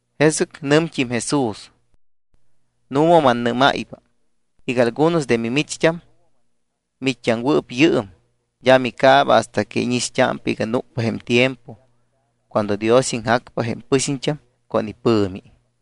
Jesɨc nɨmt́im Jesús: —Nu̱ma mannɨ́máypa iga algunos de mimicht́am miit́t́aŋwɨɨp yɨɨm, d́a micaaba hasta que íñixt́ámpa iga núcpa jém tiempo cuando Dios iŋjacpa jém pɨxiñt́am con ipɨ̱mi.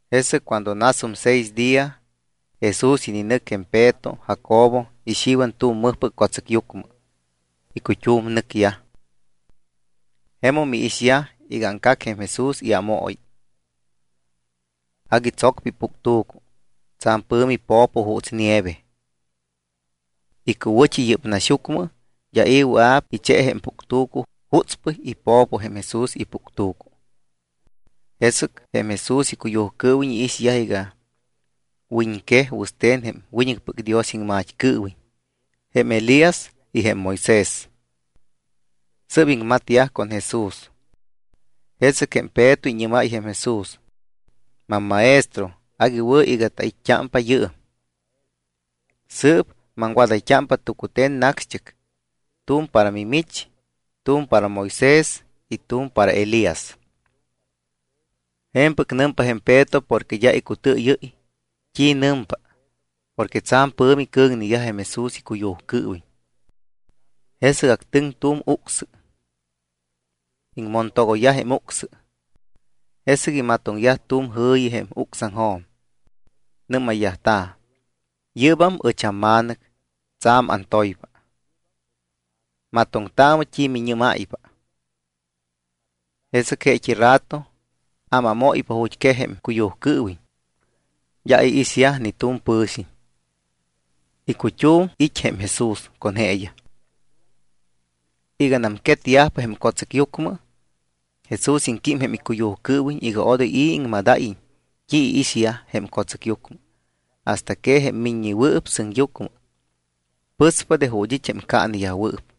Jesɨc cuando nasum seis día, Jesús ininɨc jém Peto, Jacobo, y Xiwan tu̱m mɨjpɨc co̱tsɨcyucmɨ. Icut́um nɨcyaj. Jemum iixyaj iga aŋcac jém Jesús iámooyi. Agui tsocpa ipuctu̱cu. Tsa̱m pɨ̱mi po̱po juuts nieve. Icuwɨ̱t́i yɨ́p naxyucmɨ d́a i̱ wɨa̱p iche jém puctu̱cu jutspɨy ipo̱po jém Jesús ipuctu̱cu. Jesɨc jém Jesús icuyujcɨɨwiñ iixyaj iga wiñquej wɨste̱n jém wiñɨcpɨc Dios iŋmat́cɨɨwiñ jém Elías y jém Moisés. Sɨ́p iŋmatyaj con Jesús. Jesɨc jém Peto iñɨ́máy jém Jesús: —Mammaestro, agui wɨ̱ iga tait́t́ámpa yɨɨm. Sɨɨp maŋwadayt́ámpa tucute̱n nacxt́ɨc. Tu̱m para mimich, tu̱m para Moisés y tu̱m para Elías. Je̱mpɨc nɨmpa jém Peto porque d́a icutɨɨyɨ́ypa t́i nɨmpa porque tsa̱m pɨ̱mi cɨ̱ŋneyaj jém Jesús icuyujcɨɨwiñ. Jesɨc actɨŋ tu̱m ucsɨ. Iŋmontogoyyaj jém ucsɨ. Jesɨc imatoŋyaj tu̱m jɨ̱yi jém ucsaŋjo̱m. Nɨ́mayyajta̱: —Yɨ́bam ɨch amma̱nɨc, tsa̱m antoypa. Matoŋtaamɨ t́i miñɨ́máypa. Jesɨc jeet́i rato ámámóypa ju̱t́quej jém icuyujcɨɨwiñ. D́a iixyaj ni tu̱m pɨ̱xiñ. Icut́um it́ jém Jesús con jeeyaj. Iganam quetyajpa jém co̱tsɨcyucmɨ, Jesús iŋquímpa jém icuyujcɨɨwiñ iga odoy i̱ iŋmadáyiñ t́i iixyaj jém co̱tsɨcyucmɨ hasta que jém Miññewɨɨp Sɨŋyucmɨ pɨspa de ju̱t́ it́ jém caaneyajwɨɨp.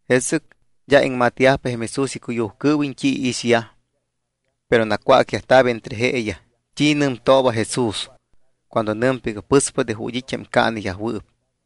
Jesɨc d́a iŋmatyajpa jém Jesús icuyujcɨɨwiñ t́i iixyaj, pero nacwácyajta̱p entre jeeyaj t́i nɨmtooba Jesús cuando nɨmpa iga pɨspa de ju̱t́ it́ jém caaneyajwɨɨp.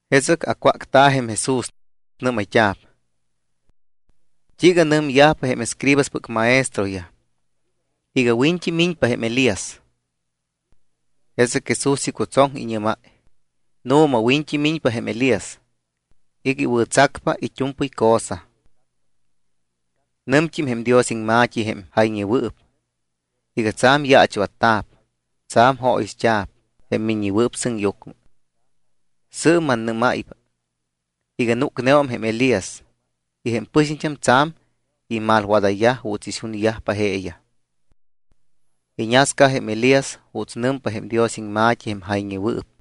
Jesɨc acwácta̱ jém Jesús, nɨ́mayt́a̱p: —¿T́iiga nɨmyajpa jém escribaspɨc maestroyaj iga wiñt́i miñpa jém Elías? Jesɨc Jesús icutsoŋ, iñɨ́máy: —Nu̱ma, wiñt́i miñpa jém Elías iga iwɨ̱tsacpa it́u̱mpɨy cosa. Nɨmt́im jém Dios iŋma̱t́i, jém jayñewɨɨp, iga tsa̱m yaachwatta̱p, tsa̱m jóyixt́a̱p jém Miññewɨɨp Sɨŋyucmɨ. Sɨɨp mannɨ́máypa iga núcneum jém Elías y jém pɨxiñt́am tsa̱m imalwadayyaj juuts ixunyajpa jeeyaj. Iñasca jém Elías juuts nɨmpa jém Dios iŋma̱t́i jém jayñewɨɨp.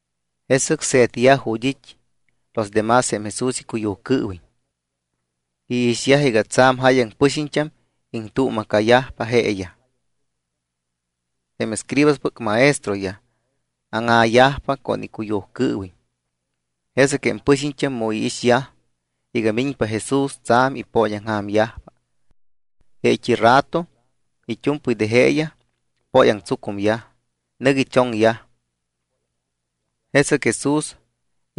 Jesɨc se̱tyaj ju̱t́ it́ los de más jém Jesús icuyujcɨɨwiñ. Iixyaj iga tsa̱m jáyaŋ pɨxiñt́am iŋtuuma̱cayajpa jeeyaj. Jém escribaspɨc maestroyaj áŋa̱yajpa con icuyujcɨɨwiñ. Jesɨc jém pɨxiñt́am, mu iixyaj iga miñpa Jesús, tsa̱m ipooñaŋja̱myajpa. Jeet́i rato it́u̱mpɨy de jeeyaj póyaŋtsucumyaj, nɨc ichoŋyaj. Jesɨc Jesús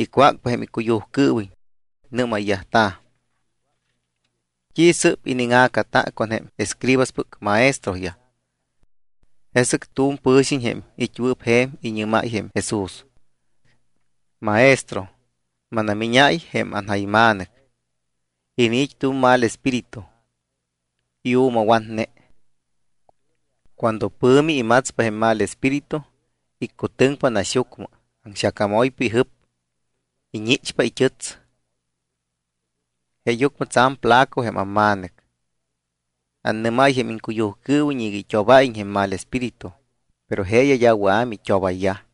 icwácpa jém icuyujcɨɨwiñ. Nɨ́mayyajta̱: —¿T́i sɨ́p iniŋa̱cata con jém escribaspɨc maestroyaj? Jesɨc tu̱m pɨ̱xiñ, jém it́wɨɨp je̱m, iñɨ́máy jém Jesús: —Maestro, mannamíñáy jém anja̱yma̱nɨc. Iniit́ tu̱m mal espíritu. Iu̱mawatne. Cuando pɨ̱mi imatspa jém mal espíritu iccutɨŋpa naxyucmɨ. Aŋxacamoypa ijɨp, iñichpa it́ɨts. Jeeyucmɨ tsa̱m flaco jém amma̱nɨc. Annɨ́máy jém iŋcuyujcɨɨwiñ iga it́obáyiñ jém mal espíritu, pero jeeyaj d́a wɨa̱ mit́obayyaj.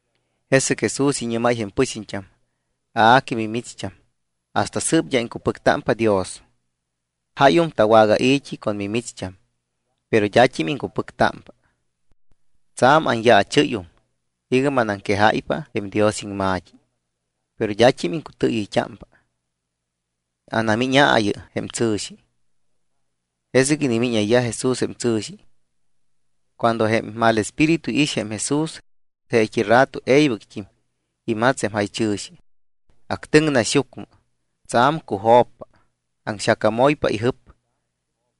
Jesɨc Jesús iñɨ́máy jém pɨxiñt́am: —A que mimicht́am hasta sɨɨp d́a iŋcupɨctámpa Dios. Jáyum tawagai̱t́i con mimicht́am, pero d́at́im iŋcupɨctámpa. Tsa̱m anyaachɨ́yum iga manaŋquejáypa jém Dios iŋma̱t́i, pero d́at́im iŋcutɨɨyɨyt́ámpa. Anamíñaayɨ jém tsɨ̱xi. Jesɨc inimíñayyaj Jesús jém tsɨ̱xi. Cuando jém mal espíritu iix jém Jesús, jeet́i rato e̱ybɨct́im imats jém jaychɨ̱xi. Actɨŋ naxyucmɨ, tsa̱m cujo̱ppa, aŋxacamoypa ijɨp.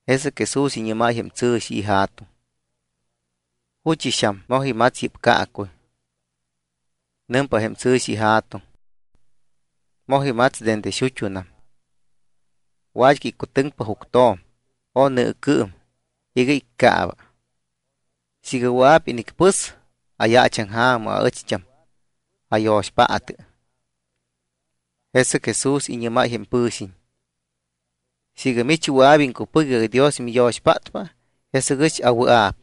Jesɨc Jesús iñɨ́máy jém tsɨ̱xi ija̱tuŋ: —¿Juchɨxam moj imats yɨ́p caacuy? Nɨmpa jém tsɨ̱xi ija̱tuŋ: —Moj imats dende xut́unam. Wat́cɨy iccutɨŋpa juctjo̱m o nɨɨcɨɨm iga iccaaba. Siiga wɨa̱p inicpɨs, ayaachaŋja̱mɨ aɨcht́am, ayo̱xpaatɨ. Jesɨc Jesús iñɨ́máy jém pɨ̱xiñ: —Siiga mich wɨa̱p iŋcupɨc iga Dios miyo̱xpátpa, jesɨc ɨch awɨa̱p.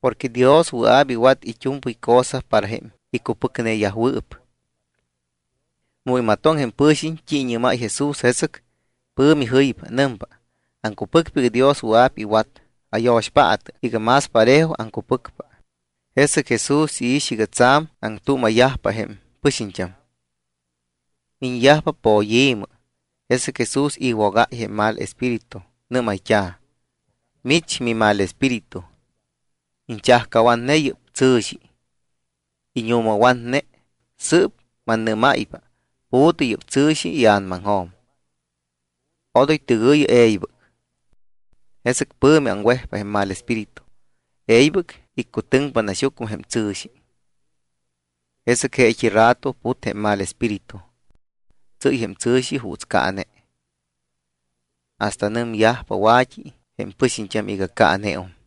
Porque Dios wɨa̱p iwat it́u̱mpɨy cosa para jém icupɨcneyajwɨɨp. Mu imatoŋ jém pɨ̱xiñ t́i iñɨ́máy Jesús, jesɨc pɨ̱mi jɨypa. Nɨmpa: —Aŋcupɨcpa iga Dios wɨa̱p iwat. Ayo̱xpaatɨ iga más parejo aŋcupɨcpa. Jesɨc Jesús iix iga tsa̱m aŋtuuma̱yajpa jém pɨxiñt́am. Miñyajpa poyi̱mɨ. Jesɨc Jesús iwogáypa jém mal espíritu. Nɨ́mayt́a̱: —Mich mimalespíritu, iñchajcawatne yɨ́p tsɨ̱xi, íñu̱mawatne, sɨɨp mannɨ́máypa, pu̱tɨ yɨ́p tsɨ̱xi ia̱namaŋjo̱m. Odoy tɨgɨ̱yɨ e̱ybɨc. Jesɨc pɨ̱mi aŋwejpa jém mal espíritu, e̱ybɨc iccutɨŋpa naxyucmɨ jém tsɨ̱xi. Jesɨc jeet́i rato put jém mal espíritu. Tsɨ́y jém tsɨ̱xi juuts caane. Hasta nɨmyajpa wa̱t́i jém pɨxiñt́am iga caaneum.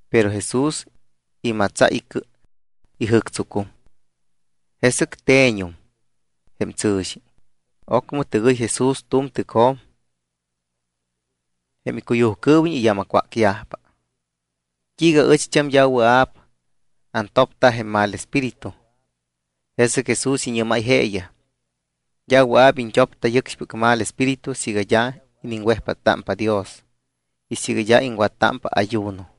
Pero Jesús imatsáy icɨ, ijɨ̱ctsucum. Jesɨc te̱ñum jém tsɨ̱xi. Ocmɨ tɨgɨy Jesús tu̱m tɨcjo̱m. Jém icuyujcɨɨwiñ iyámacwácyajpa: —¿T́iiga aɨcht́am d́a wɨa̱p antopta jém mal espíritu? Jesɨc Jesús iñɨ́máy jeeyaj: —D́a wɨa̱p iñt́opta yɨcxpɨc mal espíritu siiga d́a iniŋwejpáttámpa Dios y siiga d́a iŋwattámpa ayuno.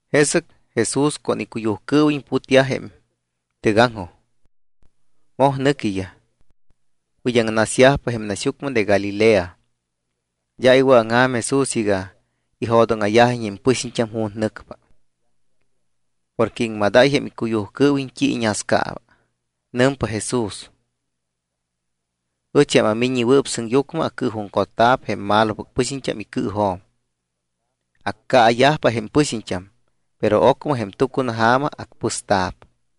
Jesɨc Jesús con icuyujcɨɨwiñ putyaj jém tɨgaŋjoj. Moj nɨquiyaj. Wid́aŋnasyajpa jém naxyucmɨ de Galilea. D́a iwɨ̱aŋja̱m Jesús iga ijo̱dóŋa̱yajiñ jém pɨxiñt́am ju̱t́ nɨcpa. Porque iŋmadáy jém icuyujcɨɨwiñ t́i iñascaaba. Nɨmpa Jesús: —Ɨch, jém aMiññewɨɨp Sɨŋyucmɨ, acɨɨjuŋcotta̱p jém malopɨc pɨxiñt́am icɨɨjo̱m. Accaayajpa jém pɨxiñt́am, pero ocmɨ jém tucunaja̱ma acpɨsta̱p.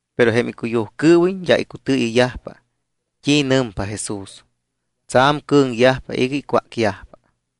Pero jém icuyujcɨɨwiñ d́a icutɨɨyɨyyajpa t́i nɨmpa Jesús. Tsa̱m cɨ̱ŋyajpa iga icwácyajpa.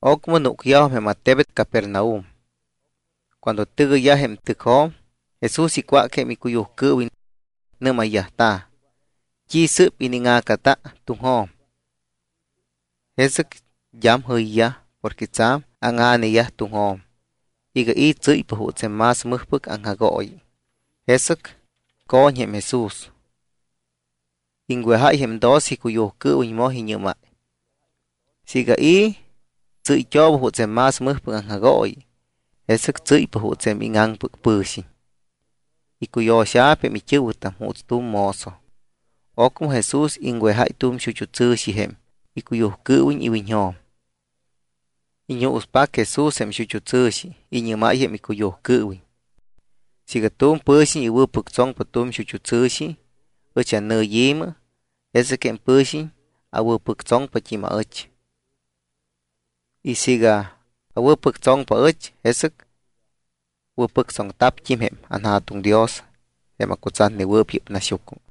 Ocmɨ núcyajum jém attebet Capernaum. Cuando tɨgɨyyaj jém tɨcjo̱m, Jesús icwác jém icuyujcɨɨwiñ. Nɨ́mayyajta̱: —¿T́i sɨ́p iniŋa̱cata tuŋjo̱m? Jesɨc d́am jɨyyaj porque tsa̱m áŋa̱neyaj tuŋjo̱m iga i̱ tsɨ́ypa juuts jém más mɨjpɨc aŋjagooyi. Jesɨc co̱ñ jém Jesús, iŋwejáy jém doce icuyujcɨɨwiñ, moj iñɨ́máy: —Siiga i̱ tsɨ́yt́ooba juuts jém más mɨjpɨc aŋjagooyi, jesɨc tsɨ́ypa juuts jém íŋaŋpɨc pɨ̱xiñ, icuyo̱xa̱p jém it́ɨ̱wɨtam juuts tu̱m mozo. Ocmɨ Jesús iŋwejáy tu̱m xut́u tsɨ̱xi jém icuyujcɨɨwiñ iwiñjo̱m. Iñuuspac Jesús jém xut́u tsɨ̱xi. Iñɨ́máy jém icuyujcɨɨwiñ: —Siiga tu̱m pɨ̱xiñ iwɨ̱pɨctsoŋpa tu̱m xut́u tsɨ̱xi ɨch annɨyi̱mɨ, jesɨc jém pɨ̱xiñ awɨ̱pɨctsoŋpat́im aɨch. Y siiga awɨ̱pɨctsoŋpa aɨch, jesɨc wɨ̱pɨctsoŋta̱pt́im jém anJa̱tuŋ Dios jém acutsatnewɨɨp yɨ́p naxyucmɨ.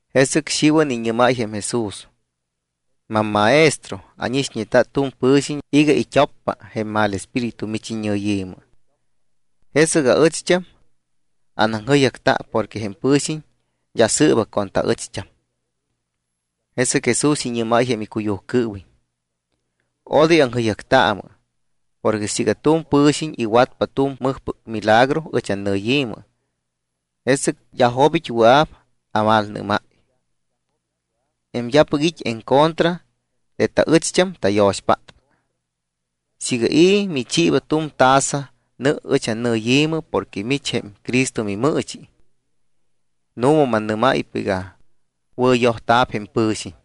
Jesɨc Xiwan iñɨ́máy jém Jesús: —Mammaestro, ánixñeta tu̱m pɨ̱xiñ iga it́oppa jém mal espíritu mich iñɨyi̱mɨ. Jesɨc aɨcht́am anaŋjɨyjacta porque jém pɨ̱xiñ d́a sɨɨba con taɨcht́am. Jesɨc Jesús iñɨ́máy jém icuyujcɨɨwiñ: —Odoy aŋjɨyjactaamɨ porque siiga tu̱m pɨ̱xiñ iwatpa tu̱m mɨjpɨc milagro ɨch annɨyi̱mɨ, jesɨc d́a jobit́ wɨa̱p amalnɨ́máy. Jém d́apɨc it́ en contra de taɨcht́am, tayo̱xpátpa. Siiga i̱ michiiba tu̱m taza nɨ ɨch annɨyi̱mɨ porque mich jém Cristo mimɨɨchi, nu̱ma mannɨ́máypa iga wɨ̱yojta̱p jém pɨ̱xiñ.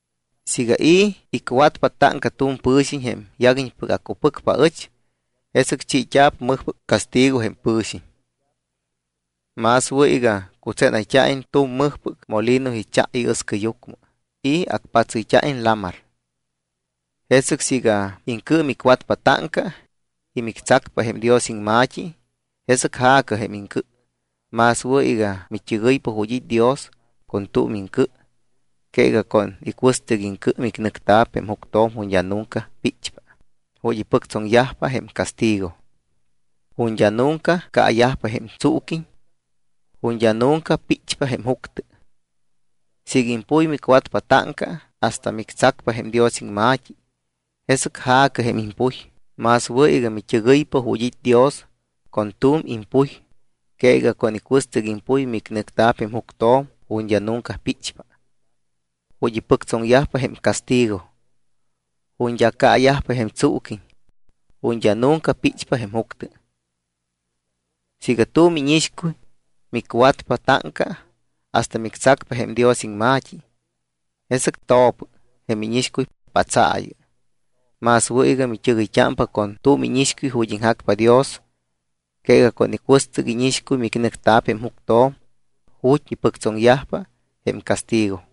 ’Siiga i̱ icwatpa táŋca tu̱m pɨ̱xiñ jém yaguiñpɨc acupɨcpa aɨch, jesɨc chiit́a̱p mɨjpɨc castigo jém pɨ̱xiñ. Más wɨ̱ iga cutsénayt́a̱iñ tu̱m mɨjpɨc molino icha iɨscɨyucmɨ y acpatsɨyt́a̱iñ lamar. Jesɨc siiga iŋcɨ micwatpa táŋca y mictsacpa jém Dios iŋma̱t́i, jesɨc ja̱cɨ jém iŋcɨ. Más wɨ̱ iga mit́ɨgɨypa ju̱t́ it́ Dios con tu̱m iŋcɨ que iga con icuɨstɨc iŋcɨ mininɨcta̱p jém juctjo̱m ju̱t́ d́a nunca píchpa, ju̱t́ ipɨctsoŋyajpa jém castigo. Ju̱t́ d́a nunca caayajpa jém tsuuquiñ, ju̱t́ d́a nunca píchpa jém juctɨ. Siiga impuy micwatpa táŋca hasta mictsacpa jém Dios iŋma̱t́i, jesɨc ja̱cɨ jém impuy. Más wɨ̱ iga mit́ɨgɨypa ju̱t́ it́ Dios con tu̱m impuy que iga con icuɨstɨc impuy mininɨcta̱p jém juctjo̱m ju̱t́ d́a nunca píchpa, ju̱t́ ipɨctsoŋyajpa jém castigo, ju̱t́ d́a caayajpa jém tsuuquiñ, ju̱t́ d́a nunca píchpa jém juctɨ. Siiga tu̱m íñixcuy micwatpa táŋca hasta mictsacpa jém Dios iŋma̱t́i, jesɨc to̱pɨ jém íñixcuy, patsaayɨ. Más wɨ̱ iga mit́ɨgɨypa con tu̱m íñixcuy ju̱t́ iŋjacpa Dios que iga con icuɨstɨc íñixcuy micnɨcta̱p jém juctjo̱m ju̱t́ ipɨctsoŋyajpa jém castigo.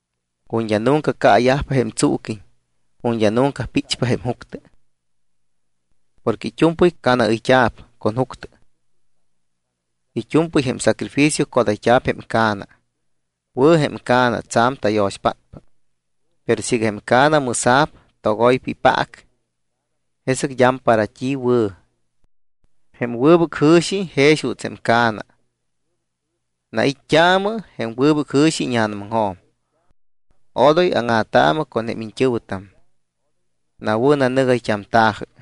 Ju̱t́ d́a nunca caayajpa jém tsuuquiñ, ju̱t́ d́a nunca píchpa jém juctɨ. ’Porque it́u̱mpɨy ca̱naɨyt́a̱p con juctɨ. It́u̱mpɨy jém sacrificio codayt́a̱p jém ca̱na. ’Wɨ̱ jém ca̱na, tsa̱m tayo̱xpátpa. Pero siiga jém ca̱na mɨsa̱p, togoypa ipaac, jesɨc d́am para t́i wɨ̱. Jém wɨbɨc jɨ̱xi jex juuts jém ca̱na. Nait́t́aamɨ jém wɨbɨc jɨ̱xi íña̱namaŋjo̱m. Odoy áŋa̱taamɨ con jém iñt́ɨ̱wɨtam, nawɨ̱nanɨgayt́amta̱jɨ.